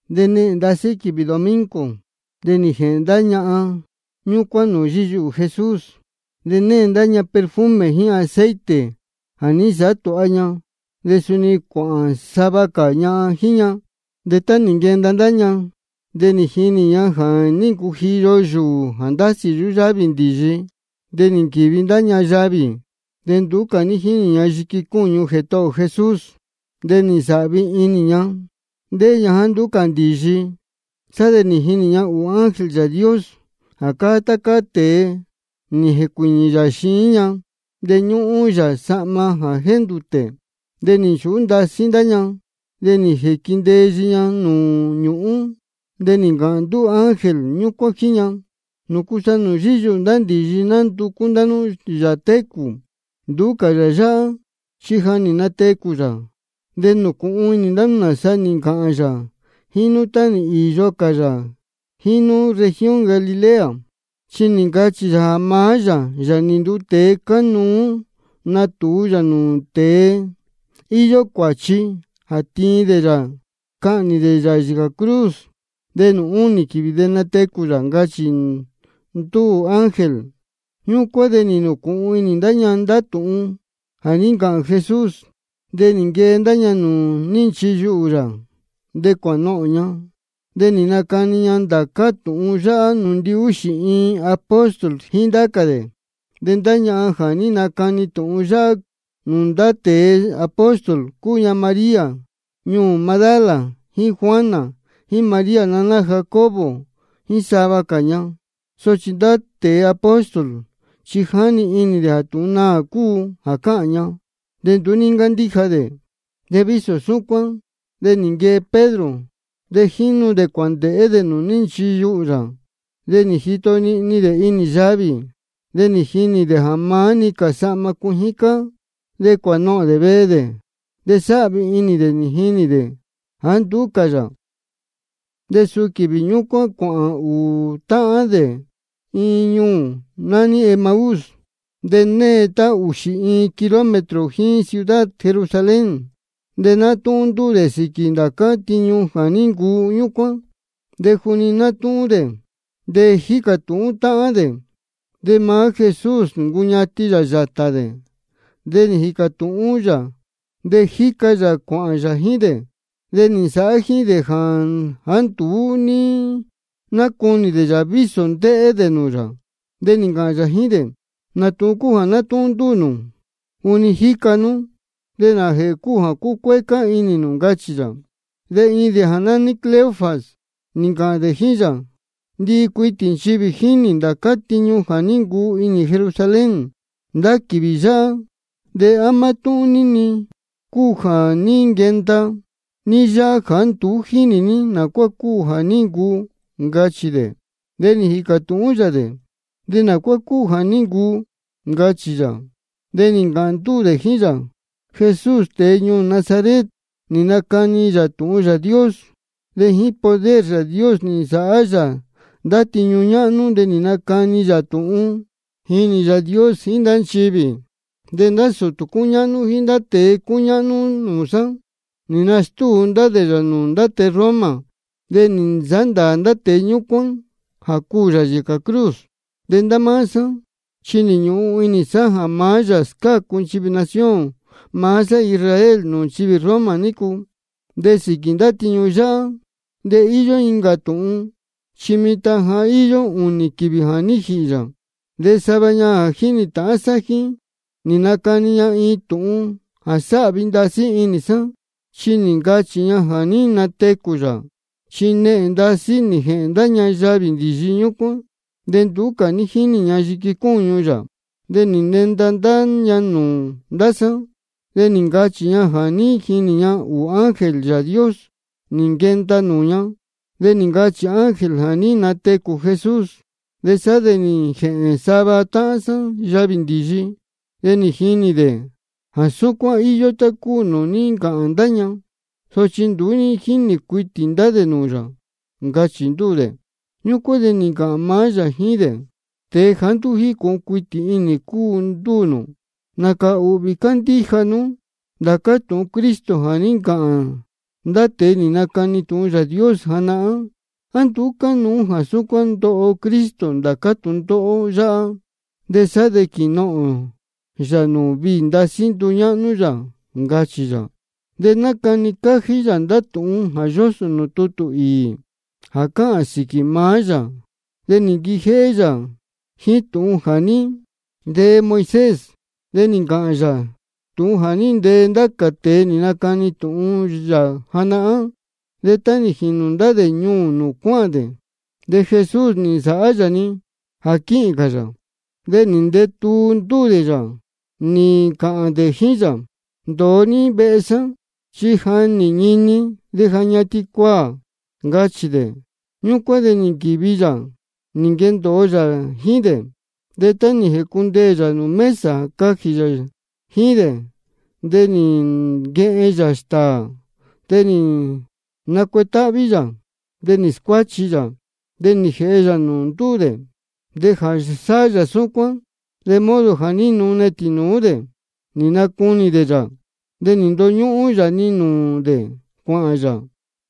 De nehēn ndasí quīvī domingo de nī jēhēn ndá ñahan ñúcuán nūū yíyuhū Jesús, de née ña ndá perfume jíín aceite jā ní nsāhá tūha ña. De suni cuāhān sava cā ñahan jíín ña. De tá nī nquenda ndá ña, de nī jinī ña ja nī ncujiyo yūū jā ndásī yuhú yávī ndīyi. De nī nquīvi ndá ña yavī, de nduú cā ní jínī ña yiqui cúñu Jētohō ō Jesús. De nī ncunēhén inī ña ndéhé ña jāá nduú cā ndīyi. Sá de nī jinī ña ūū ángel Yāā Dios jā cáá tá cáá tēe, nī jēcuīñī yā xiín ña, de ñúhún yā sahma jā jéndūtē. De nī nchūhú ndasí ndá ña, de nī jīquindeyi ña nūū ñūhún. De nī ncāhān ndúū ángel ñúcuán jíín ña: ¿Nūcu sa nūū yíyuhū ndīyi nánducú ndá nú Yāā técū? Nduú cā yā yáhá, chi ja nī natecū yā. De nūcūhun inī ndá nú nāsa nī ncāhān yā jíín nú tá nī īyo cā yā jíín nú región Galilea. Chi nī ncachī yā jā maá yā, Yāā nī nduu tēe, cánuú natūu yā nūū ndá tēe íyó cuāchi, jā tiin dē yā cahnī dē yā yīcā cruz, de nūū únī quīvī de natecū yā, ncachī ndúū ángel. Ñúcuán de nī nūcūhun inī ña ndá tūhun jā ní ncāhān Jesús. De nī nquee ndá ña nūū ní nchiyuhū yā, de cuānohōn ña. De nī nacani ña ndācá tūhun yáhá nūū ndihúxī iin apóstol jíín nūū ndá cā dē. De ndá ñahan jā ní nacani tūhun yáhá nūū ndá tēe apóstol, cúu ña María ñuū Magdala, jíín Juana, jíín María naná Jacobo, jíín sava cā ña. Sochi ndá tēe apóstol chi jáni inī dē jā tūhun naā cúu jā cáhān ña, de nduú ní ncándíja dē. De vísō súcuán de nī nquee Pedro, de jínu dē cuāndēhé dē nūū ní nchiyuhū yā. De nī jito nihni dē inī yavī, de nī jinī dē jā maá-ni cā sahma cuijín cáá. De cuānohōn dē vehe dē, de sáhvi inī dē nī jinī dē jāá nduú cā yā. De suu quīvī ñúcuán cuāhān ūū táhān dē iin ñuū nání Emaús, jā née tá ūxī iin kilómetro jíín ciudad Jerusalén. De nátúhún ndúū dē sīquī ndācá tiñu jā ní ncuu ñúcuán. De juni nátúhún dē de jícā tūhún táhán de, de maá Jesús nī ncuñatin yā yātā dē, de jíca yā cuāhān yā jíín dē. De nī nsāhá jíín dē jāá nduú ní nácunī dē yā vísō ndéhé dē nūū yā. De nī ncāhān yā jíín dē: ¿Nā tūhun cúu jā nátúhún ndúū nū juni jíca nú? ¿De nājēhē cúu jā cúcuécá inī nū? ncachī yā. De iin dē jā nání Cleofas nī ncāhān jíín yā: Ndihi cuitī nchivī jínī ji ndācá tiñu jā ní ncuu inī Jerusalén ndá quīvī yáhá. ¿De á mátúhún-ni ní cúu jā ní nquenda ní yáhá jāá nduú jínī ní nā cuá cúu jā ní ncuu? ncachī dē. De nī jīcā tūhún yā dē: ¿De nā cuá cúu jā ní ncuu? ncachī yā. De nī ncāhān ndúū dē jíín yā: Jesús tēe ñuū Nazaret, nī nacani yā tūhun Yāā Dios, de jíín poder Yāā Dios nī nsāhá yā ndá tiñu ñáhnú de nī nacani yā tūhun, nī jinī Yāā Dios jíín ndá nchivī. De ndá sūtū cúñáhnú jíín ndá tēe cúñáhnú nūū sá, nī nastúu ndá dē yā nūū ndá tēe Roma, de nī nsāhá ndāā ndá tēe ñúcuán jā cuū yā yīcā cruz. De ndá máá sá chi nī ñūhun inī sá jā maá yā scácu nchivī nación maá sá Israel nūū nchivī Roma nícu. De sīquī ndá tiñu yáhá, de íyó incā tūhun. Chi mitan ja íyó ūnī quīvī jā ní jīhī yā. De sava ñahan jā jínī tāhán sá jíín, nī nacani ña iin tūhun jā sáhvi ndasí inī sá, chi nī ncachī ña jā ní natecū yā. Chi nehēn ndasí nī jēhēn ndá ña yavī ndīyi ñúcuán. De nduú cā ní jínī ña yiqui cúñu yā. De nī nenda ndá ña nūū ndá sá, de nī ncachī ña jā ní jinī ña ūū ángel Yāā Dios nī nquenda nūū ña, de nī ncachī ángel jā ní natecū Jesús. Sá de nī jēhēn sava táhán sá yavī ndīyi, de nī jinī dē jā súcuán íyó tá cúu nūū ní ncāhān ndá ña, sochi nduú ní jínī cuitī ndá dē nūū yā, ncachī ndúū dē. Ñúcuán de nī ncāhān maá yā jíín dē: Tēe jāá nduú jícūhun cuitī inī cúu ndúū nū. Nācā ūhvī cándíja nú ndācá tūhun Cristo jā ní ncāhān ndá tēe nī nacani tūhun Yāā Dios janahán. ¿A nduú cánuú jā súcuán ndoho Cristo ndācá tūndóhó yáhá, de sá de quīnohōn yā nūū viī ndasí nduñáhnú yā? ncachī yā. De nī nacani cájí yā ndá tūhun jā yósō nūū tutū īī jā cáhān sīquī maá yā. De nī nquijéhé yā jíín tūhun jā ní ntee Moisés, de nī ncāhān cā yā tūhun jā ní ntee ndá cā tēe nī nacani tūhun yā janahán. De tá nī jīnū ndá dē ñuū nūū cuáhān dē, de Jesús nī nsāhá yā-ni jā quíhīn cā yā. De nī ndeē tuu ndúū dē yā, nī ncāhān dē jíín yā: Ndōo ní vehe sá, chi ja nī ñini de ja ñatin cuaā, ncachī dē. Ñúcuán de nī nquīvi yā jā quendōo yā jíín dē. De tá nī jēcundeē yā nūū mesa jā cajī yā jíín dē, de nī nquehen yā stāā, de nī nacuetáhví yā, de nī scuáchi yā, de nī jēhe yā nūū ndúū dē. De jā sáhá yā súcuán, de modo jā ní nune tīnūú dē, de nī nacunī dē yā. De nī ndoñúhún yā-ni nūū dē cuāhān yā.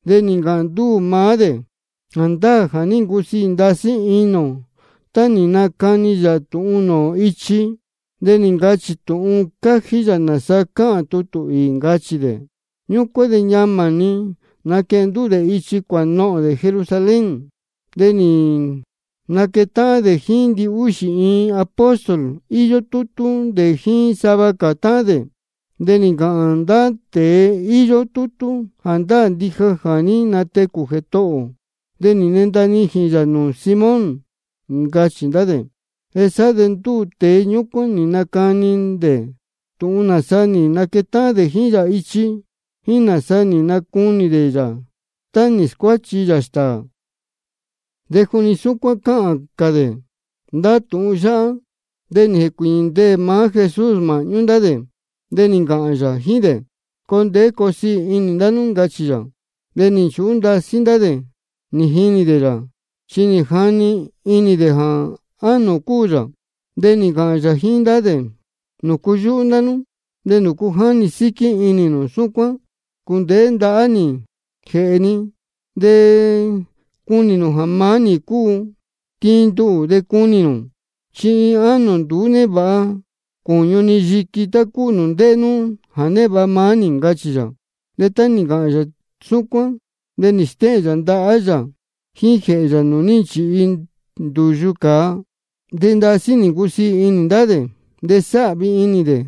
De nī ncāhān ndúū maá dē: Jāndáā jā ní ncusiī ndasí inī ō tá nī nacani yā tūhun nūū ō ichi, de nī ncachī tūhun cájí yā nāsa cáhān tutū īī, ncachī dē. Ñúcuán de ñamā nī naquehen ndúū dē ichi cuānohōn dē Jerusalén. De nī naquetáhán dē jíín ndihúxī iin apóstol, íyó tútú dē jíín sava cā táhán dē. De nī ncāhān ndá tēe íyó tútú: Jāndáā ndija jā ní natecū Jētohō ō, de nī nenda nijīn yā nūū Simón, ncachī ndá dē. Sá de ndúū tēe ñúcuán nī nacani dē tūhun nāsa nī nquetáhán dē jíín yā ichi, jíín nāsa nī nacunī dē yā tá nī scuáchi yā stāā. De juni súcuán cáhān cā dē ndá tūhun yáhá, de nī jēcuīñī ndeē-ni maá Jesús māhñú ndá dē. De nī ncāhān yā jíín dē: Coo ndeé coo siī inī ndá nú, ncachī yā. De nī nchūhú ndasí ndá dē nī jinī dē yā, chi nī jani inī dē jā ánō cúu yā. De nī ncāhān yā jíín ndá dē: ¿Nūcu yúhú ndá nú, de nūcu jáni síquí inī nū súcuán? Cūndēhé ndahá nī jíín jēhē ni, de cunī nū jā maá nī cúu. Tiin nduhū de cunī nū, chi iin ánō nduú névāha cūñu ni yiqui tá cúu nūū ndéhé nú jā névāha maá nī, ncachī yā. De tá nī ncāhān yā súcuán, de nī stéhēn yā ndahá yā jíín jēhē yā nūū ní nchīhi ndūyu cāa. De ndasí nī ncusiī inī ndá dē, de sáhvi inī dē.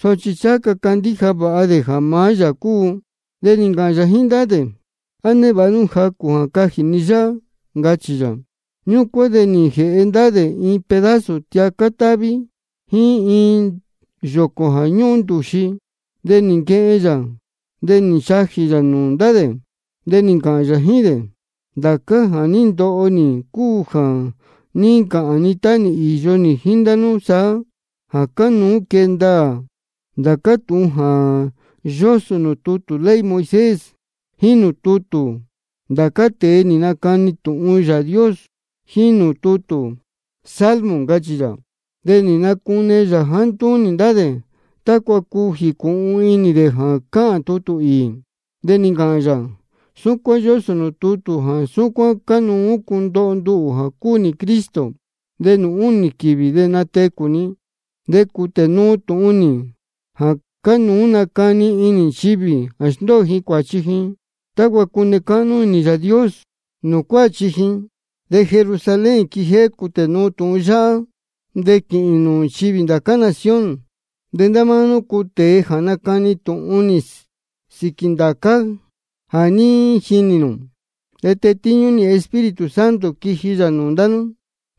Sochi ncháha ca candíja vāha dē jā maá yā cúu. De nī ncāhān yā jíín ndá dē: ¿A névāha nú jacū jā cajī ni yáhá? ncachī yā. Ñúcuán de nī jēhe ndá dē iin pedazo tiacá táví jíín iin yōcō jā ñúhún ndūxi. De nī nquehen yā, de nī nchajī yā nūū ndá dē. De nī ncāhān yā jíín dē: Ndācá jā ní ndoho nī cúu jā ní ncāhān ni tá nī īyo nī jíín ndá nú saá, jā cánuú quee ndaā ndācá tūhun nī jā yósō nūū tutū ley Moisés, jíín nūū tutū ndá cā tēe nī nacani tūhun Yāā Dios, jíín nūū tutū salmo, ncachī yā. De nī nacune yā jāá ntúnī ndá dē, tácua cuu jīcūhun inī dē jā cáhān tutū īī. De nī ncāhān yā: Súcuán yósō nūū tutū jā súcuán cánuú cundoho nduhū jā cúu nī Cristo, de nūū únī quīvī de natecū ni. De cūtē nuu tūhun nī jā cánuú nacani inī nchivī jā sndóo ji cuāchi ji, tácua cune cáhnú inī Yāā Dios nūū cuáchi ji. De Jerusalén quijéhé cūtē nuu tūhun yáhá, de quīhīn nūū nchivī ndācá nación. De ndá máá nú cúu tēe jā nacani tūhun sīquī ndācá jā ní jinī nū. De tetíñú nī Espíritu Santo quiji yā nūū ndá nú,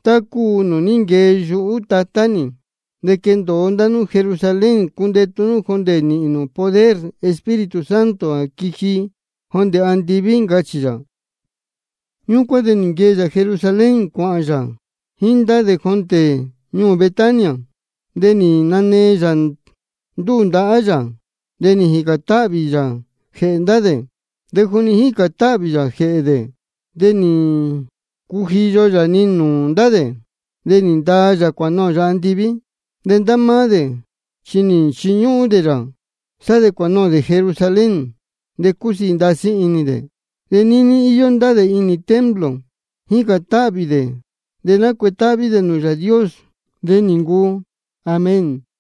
tá cúu nūū ní nquee yuhú Tatá nī. De quendōo ndá nú Jerusalén cundetu nú jondē nīhīn nū poder Espíritu Santo jā quiji jondē andiví, ncachī yā. Ñúcuán de nī nquee yā Jerusalén cuāhān yā jíín ndá dē jondē ñuū Betania. De nī nanee yā ndúū ndahá yā, de nī jīcān táhvī yā jēhē ndá dē. De juni jícān táhvī yā jēhē dē, de nī ncujiyo yā-ni nūū ndá dē, nī ndaa yā cuānohōn yā andiví. De ndá máá dē chi nī nchiñúhún dē yā. Sá de cuānohōn dē Jerusalén, de cúsiī ndasí inī dē. De níní íyó ndá dē inī templo, jícān táhvī dē de nácuetáhví dē nūū Yāā Dios. De nī ncuu. Amén.